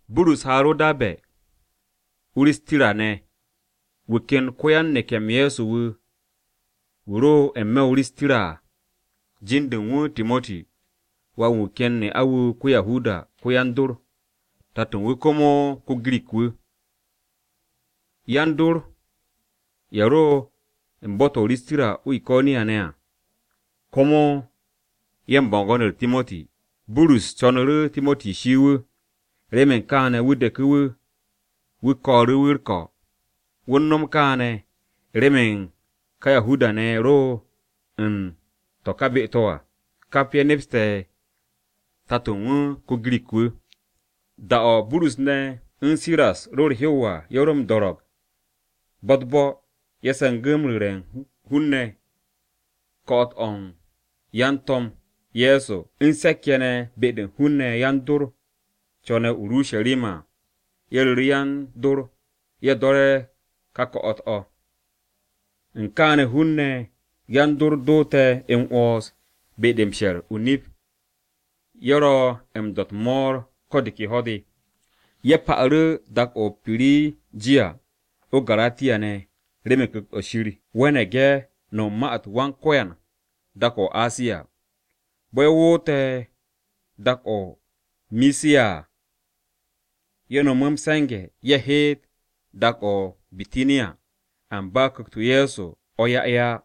Burus haaru̱ o-Darbe̱, o-Ristira ne̱. Wu̱ ken ko-ya-neke̱-m Ye̱so wu̱ ro n-me̱ o-Risiya à, jin-de u̱n wu̱ Timoti, wà-wu̱ u̱n wu̱ ken ne'a-wu̱ ko-Yahuda ko-yan-dor. Tato u̱n wu̱ komo ko-Girik-wu̱. Yan-dor ye̱ ro u̱n bo̱-to̱ o-Risiya o-Iko̱niya ne̱ à, komo ye̱ u̱n bo̱ngo̱n-u̱r Timoti. Burus co̱nu̱ru̱ Timoti shii wu̱. Remen kaane̱, wu̱ deku̱ wu̱, wu̱ ko̱ru̱ wu̱ u̱r-ko̱. Wu̱ u̱n no̱m kaane̱ remen ka Yahuda-ne̱ ye̱ ro u̱n to̱ ka be-to̱ à, kap ye̱ nepste̱ tato u̱n wu̱ ko-Girik-wu̱. Da-o̱ Burus ne̱ u̱n Siras ro u̱r-hew à, ye̱ ro m-do̱ro̱g bo̱-u̱t-bo̱, ye̱ se̱ngu̱ m-ru̱re̱ u̱n hun-ne̱ ko̱'o̱t-o̱ yan-To̱m Ye̱so u̱n se̱k-ye̱ ne̱ be-de u̱n hun-ne̱ yan-dor co̱ne̱ o-Urusharima à, ye̱ ru̱ru̱ yan-dor-ye̱ do̱re̱ ka ko̱'o̱t-o̱. U̱n kaane̱ hun-ne̱ yan-dor doote̱ m-'wo̱ns be-de m-she̱r o-nip, ye̱ ro̱ m-do̱ u̱t-mo̱o̱r ko̱ de ke ho̱-de. Ye̱ pa'u̱ru̱ dak-to̱ o-Pirijiya o-Garatiya ne̱, remen Ku̱kt-o̱ Shir we̱ne̱g ye̱ no̱m u̱n ma-u̱t Wan-Ko̱yan dak-o̱ o-Asiya. Bo̱ ye̱ woote̱ dak-o̱ o-Misiya à, ye̱ no̱mu̱ m-se̱nge̱ ye̱ heet dak-o̱ o-Bitaniya, amba Ku̱kt-o Ye̱so o̱ 'ya ye̱ á.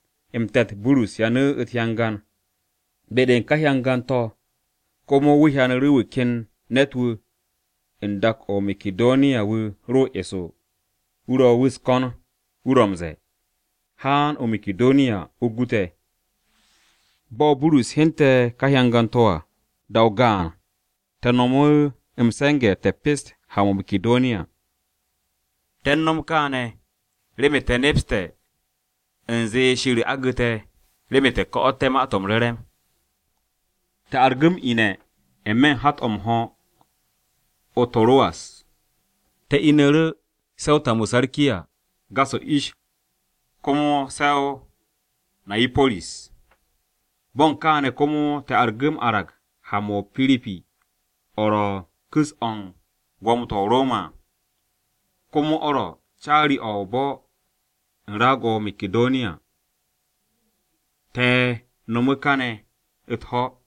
M-Te̱t, Burus hyanu̱ u̱t-hyangan. Be-de u̱n ka hyangan-to̱ komo wu̱ hyanu̱ru̱ wu̱ ken ne̱t-wu̱ u̱n dak-o̱ o-Makidoniya wu̱ ro eso, wu̱ ro wu̱ u̱s-ko̱n wu̱ ro̱ m-ze̱e̱, “Haan o-Makidoniya, o gu te̱.” Bo̱ Burus hyente̱ ka hyangan-to̱ à, da-o gaan, te̱ no̱mu̱ m-se̱nge̱ te̱ pest ha-mo̱ o-Makidoniya. Te̱ u̱n no̱m kaane̱, remen te̱ nepste̱ u̱nze Shir agu̱ te̱, remen te̱ ko̱'o̱tté̱ Ma-to̱ m-Re̱re̱m. Te̱ argu̱ m-ine̱ n-me̱ u̱n hat-o̱ m-ho̱ o-To̱ruwas te̱ inu̱ru̱ se̱ o-Samutarkiya. Gas o-ish, komo se̱ o-Niyapo̱ris. Bo̱ u̱n kane̱ komo te̱ argu̱ m-arag ha-mo̱ o-Piripi o̱ ro̱ u̱n ku̱s-o̱ u̱n gwo̱mo-to̱ o-Roma à, komo o̱ ro̱ caari-o̱ o-bo̱ u̱n raag-o̱ o-Makidoniya. Te̱ no̱mu̱ kane̱ u̱t-ho̱.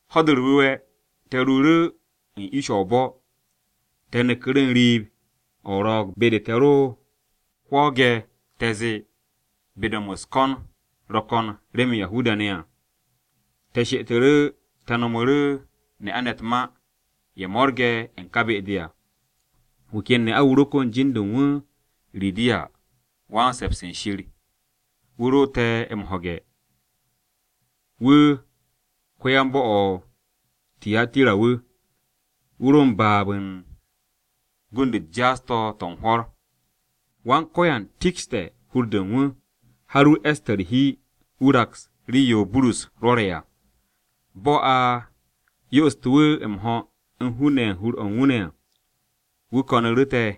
Ho̱-de u̱r-Wu̱we̱, te̱ ruuru̱ u̱n ish-o o-bo̱, te̱ neku̱ru̱ n-riib o-ro̱o̱g be-de te̱ ro hwo̱o̱ge̱ te̱ zee be-de u̱n no̱m u̱s-ko̱n ro̱ ko̱n remen Yahuda-ne̱ à. Te̱ she'etu̱ru̱ te̱ nomu̱ru̱ ne'a-ne̱ u̱t-ma ye̱ mo̱rge̱ u̱n ka be-de à. Wu̱ ken ne'a-wu̱ ro kon jin-de u̱n wu̱ Ridiya, “Wan-se̱ps u̱n Shir,” wu̱ ro te̱ m-ho̱ge̱. Wu̱ ko-yan-bo̱-o̱ o-Tiyatira wu̱, wu̱ ro m-baab u̱n gund-u̱t jaas-to̱ to̱ u̱n hwo̱r. Wan-Ko̱yan tikshte̱ hur-de u̱n wu̱, har wu̱ e̱ste̱ u̱r-hi wu̱ raks rii-yo Burus rwo̱re̱ à. Bo̱ a yo'ostu̱ wu̱ m-ho̱ u̱n hun-ne̱ ye̱ u̱n hur-o̱ u̱n wu̱ ne̱ à, wu̱ ko̱nu̱ru̱ te̱.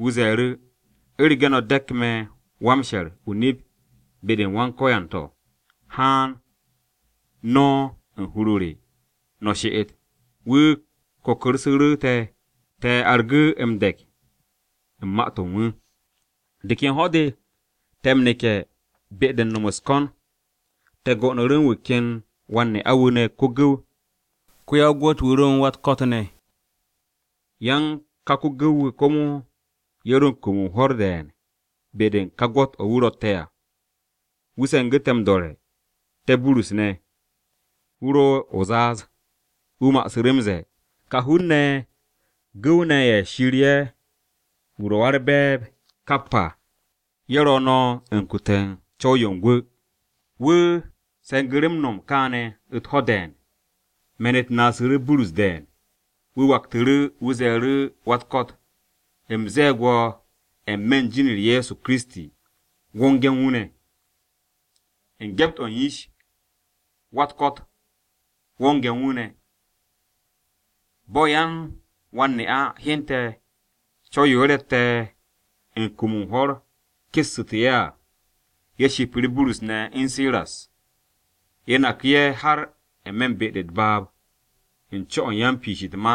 Wu̱ ze̱e̱ru̱, “U̱rege̱ no̱ de̱k me̱ wan-she̱r o-nip be-u̱r Wan-Ko̱yan to̱, haan no̱ u̱n hur-o re, no̱ she'et.” Wu̱ kokorsu̱ru̱ te̱, te̱ argu̱ m-de̱k u̱n ma-to̱ u̱n wu̱. De ken ho̱-de, te̱ m-neke̱ be-de u̱n no̱m u̱s-ko̱n, te̱ go'onu̱ru̱ u̱n wu̱ ken wan-ne'a-wu̱ ne̱ ko-gu̱w, ko-ya-o-gwo̱t-wu̱ ro u̱n wa-u̱t-ko̱t ne̱. Yan ka ko-gu̱w-wu̱ komo ye̱ ro u̱n kum u̱n hwo̱r de̱e̱n be-de u̱n ka gwo̱t-o̱ wu̱ ro̱tte̱ à. Wu̱ se̱ngu̱ te̱ m-do̱re̱, te̱ Burus ne̱, wu̱ ro o-zaaz. Wu̱ ma'asu̱ru̱ m-ze̱e̱, “Ka hun-ne̱ ye̱ gu̱w-ne̱ Shir ye̱ wu̱ ro̱ Wa-u̱r-Be̱e̱b Kap à, ye̱ ro̱ no̱ u̱n kute̱ u̱n co̱w-yo u̱n gwu̱!” Wu̱ se̱ngu̱ru̱ m-no̱m kaane̱ u̱t-ho̱ de̱e̱n. Me̱n-u̱t naasu̱ru̱ Burus de̱e̱n, wu̱ waktu̱ru̱. Wu̱ ze̱e̱ru̱ wa-u̱t-ko̱t, “U̱m ze̱e̱g wo̱ n-me̱ u̱n jin-u̱r Ye̱so Kiristi, wonge̱ u̱n wu̱ ne̱.” U̱n gyept-o̱ u̱n yish, wa-u̱t-ko̱t wonge̱ u̱n wu̱ ne̱. Bo̱ yan-wan-ne'a hyente̱ co̱w-yo ye̱ rotte̱ u̱n kum u̱n hwo̱r kessu̱te̱ ye̱ à, ye̱ shipu̱ru̱ Burus ne̱ u̱n Siras. Ye̱ naku̱ ye̱ har n-me̱ u̱n be-de u̱t-baab u̱n co-o̱ u̱n yan-piish u̱t-ma.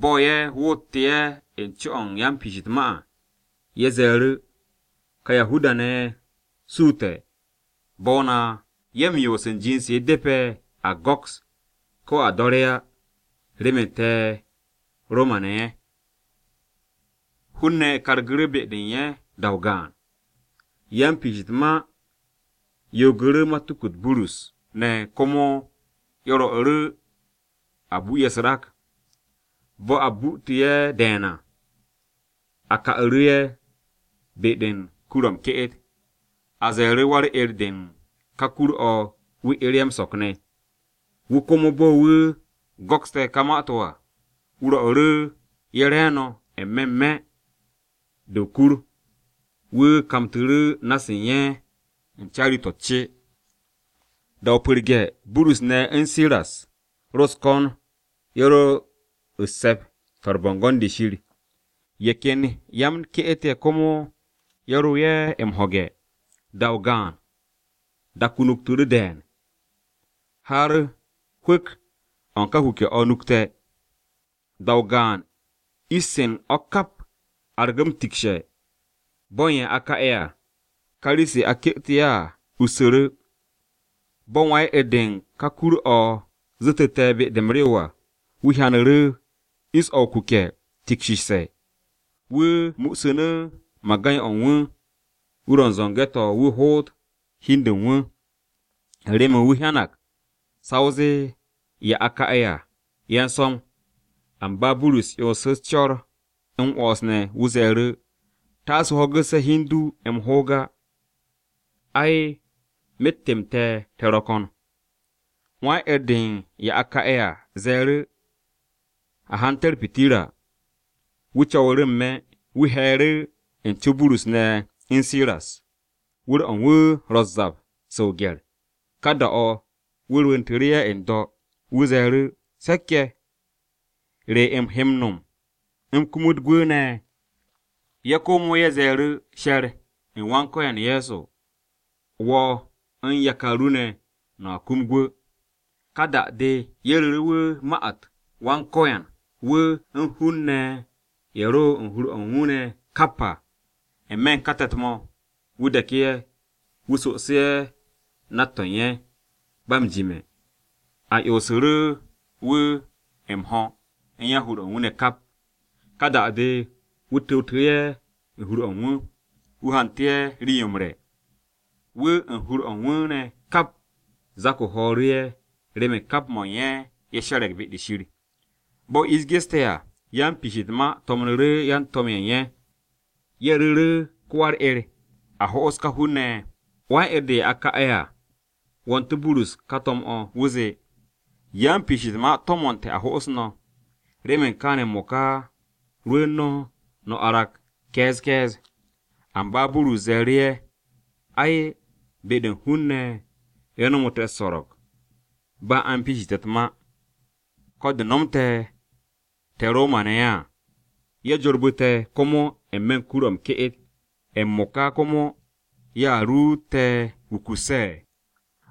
Bo̱ ye̱ woote̱ ye̱ u̱n co-o̱ u̱n yan-piish u̱t-ma à, ye̱ ze̱e̱ru̱, “Ka Yahuda-ne̱ ye̱ suute̱ bo̱-o na. Ye̱ m-yoos u̱n jind-se depe̱ a go̱ks ko̱ a do̱re̱ á, remen te̱ Roma-ne̱ ye̱.” Hun-ne̱ kargu̱ru̱ be-de u̱n ye̱ da-o gaan. Yan-piish u̱t-ma yoogu̱ru̱ matuku-u̱t Burus ne̱ komo ye̱ rwo̱'u̱ru̱ a bu ye̱ u̱s-rak. Bo̱ a bu'ute̱ ye̱ de̱e̱n à, a ka'u̱ru̱ ye̱ be-de u̱n kur-o̱ m-ke'et. A ze̱e̱ru̱ wa-u̱r-'er de u̱n ka kur-o̱ wu̱ 'er ye̱ m-so̱k ne̱. Wu̱ komo bo̱ wu̱ go̱kste̱ to̱ ka ma-to̱ à, wu̱ rwo̱'u̱ ye̱ re̱e̱no̱ n-me̱ n-me̱ de o-kur, wu̱ kamtu̱ru̱ na-se u̱n ye̱ u̱n caari-to̱ u̱t-ce. Da-o pu̱rge̱, Burus ne̱ u̱n Siras ro u̱s-ko̱n ye̱ ro u̱s-se̱p to̱ u̱n bo̱ngo̱n-de Shir. Ye̱ ken yan-m-ke'et ye̱ komo ye̱ ro ye̱ m-ho̱ge̱. Da-o gaan, dak-o nuktu̱ru̱ de̱e̱n, har hwu̱k-o̱ u̱n ka kuke̱-o̱ nukte̱. Da-o gaan ish-se u̱n o̱ kap argu̱ m-tikshe̱, bo̱ u̱n ye̱ a ka'e̱ à, ka rii-se a ke'etu̱ ye̱ à ussu̱ru̱. Bo̱ wan-'er-de u̱n ka kur-o̱ zu̱tu̱te̱ be-de m-rew à, wu̱ hyanu̱ru̱ ish-se o-kuke̱ tikshishe̱, wu̱ mu'usu̱nu̱ magay-o̱ u̱n wu̱, wu̱ ro u̱n zo̱nge̱-to̱ wu̱ hoot hi u̱n de u̱n wu̱, u̱n remen wu̱ hyanag sa o zee ye̱ a ka'e̱ à ye̱ u̱n so̱m. Amba Burus 'yonsu̱ co̱r m-'wo̱ns ne̱. Wu̱ ze̱e̱ru̱, “Taase o ho̱gu̱sse̱ hi u̱n du m-hoog á. Ai, myet-m te̱ te̱ ro̱ ko̱n!” Wan-'er-de u̱n ye̱ a ka'e̱ à ze̱e̱ru̱ u̱nze a hante̱ u̱t-pitirra. Wu̱ co̱wu̱ru̱ n-me̱, wu̱ he̱e̱ru̱ u̱n co Burus ne̱ u̱n Siras. Wu̱r-o̱ u̱n wu̱ ro̱ u̱s-zap se o-gye̱r. Ka da-o̱, wu̱ rwu̱ntu̱ru̱ ye̱ n-do̱. Wu̱ ze̱e̱ru̱, “Se̱k-ye̱, ¿re u̱m he m-no̱m u̱m kumut gwu̱ ne̱?” Ye̱ komo ye̱ ze̱e̱ru̱, “She̱r u̱n Wan-Ko̱yan Ye̱so, wo̱ u̱n yakar ru ne̱, no̱a kum gwu̱.” Ka da-de, ye̱ ru̱ru̱ wu̱ ma-u̱t Wan-Ko̱yan, wu̱, u̱n hun-ne̱ ye̱ ro u̱n hur-o̱ u̱n wu̱ ne̱ kap à. N-me̱ u̱n ka te̱t-mo̱, wu̱ deku̱ ye̱, wu̱ sosu̱ru̱ ye̱ nat-to̱ u̱n ye̱. Ba m-jime̱, a yo'osu̱ru̱ wu̱ m-ho̱ u̱n yan-hur-o̱ u̱n wu̱ ne̱ kap. Ka da-de, wu̱ tu̱wtu̱ru̱ ye̱ u̱n hur-o̱ u̱n wu̱, wu̱ hantu̱ ye̱ rii-yo m-re̱. Wu̱ u̱n yan-hur-o̱ u̱n wu̱ ne̱ kap zak-o ho̱o̱ru̱ ye̱ remen kap mo̱ u̱n ye̱ ye̱ she̱re̱g be-de Shir. Bo̱ ish geste̱ à, yan-piish u̱t-ma to̱mnu̱ru̱ yan-to̱m-ye̱ u̱n ye̱. Ye̱ ru̱ru̱ru̱ ko-wan-u̱r-'er, “A ho'os ka hun-ne̱ ye̱.” Wan-'er-de u̱n ye̱ a ka'e̱ à wo̱ntu̱ Burus ka to̱m-o̱, wu̱ zee, “Yan-piish u̱t-ma to̱mo̱nte̱ a ho'os no̱. Remen kaane̱ m-mo̱ka, rwu̱u̱n no̱, no̱ arag ke̱e̱z ke̱e̱z.” Amba Burus ze̱e̱ru̱ ye̱, “Ai, be-de u̱n hun-ne̱ ye̱ nomo te̱ u̱s-so̱ro̱g, ba a m-piishi te̱ u̱t-ma, ko̱ de̱ nomte̱ te̱ Roma-ne̱ ye̱ à. Ye̱ jorbu̱ te̱ komo n-me̱ u̱n kur-o̱ m-ke'et, m-mo̱ka komo ¿ye̱a ruut te̱ wukusse̱?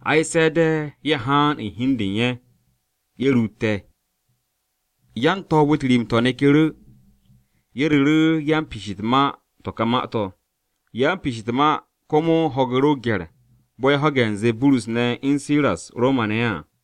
Ay! Se̱ de̱ ye̱ haan u̱n hi u̱n de u̱n ye̱, ye̱ ruut te̱.” Yan-to̱o̱b-u̱t rim-to̱ neku̱ru̱. Ye̱ ru̱ru̱ yan-piish u̱t-ma to̱ ka ma-to̱. Yan-piish u̱t-ma komo ho̱gu̱ru̱ o-gye̱r bo̱ ye̱ ho̱ge̱ u̱nze Burus ne̱ u̱n Siras Roma-ne̱ ye̱ à.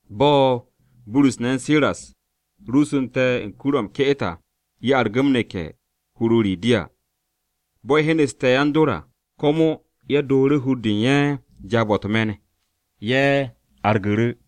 Bo̱ Burus ne̱ u̱n Siras ruusu̱nte̱ u̱n kur-o̱ m-ke'et à, ye̱ argu̱ m-neke̱ hur-o Ridiya. Bo̱ ye̱ hyenu̱ste̱ yan-dor à, komo ye̱ dooru̱ hur-de u̱n ye̱ jaab-o̱ u̱t-me̱n, ye̱ argu̱ru̱.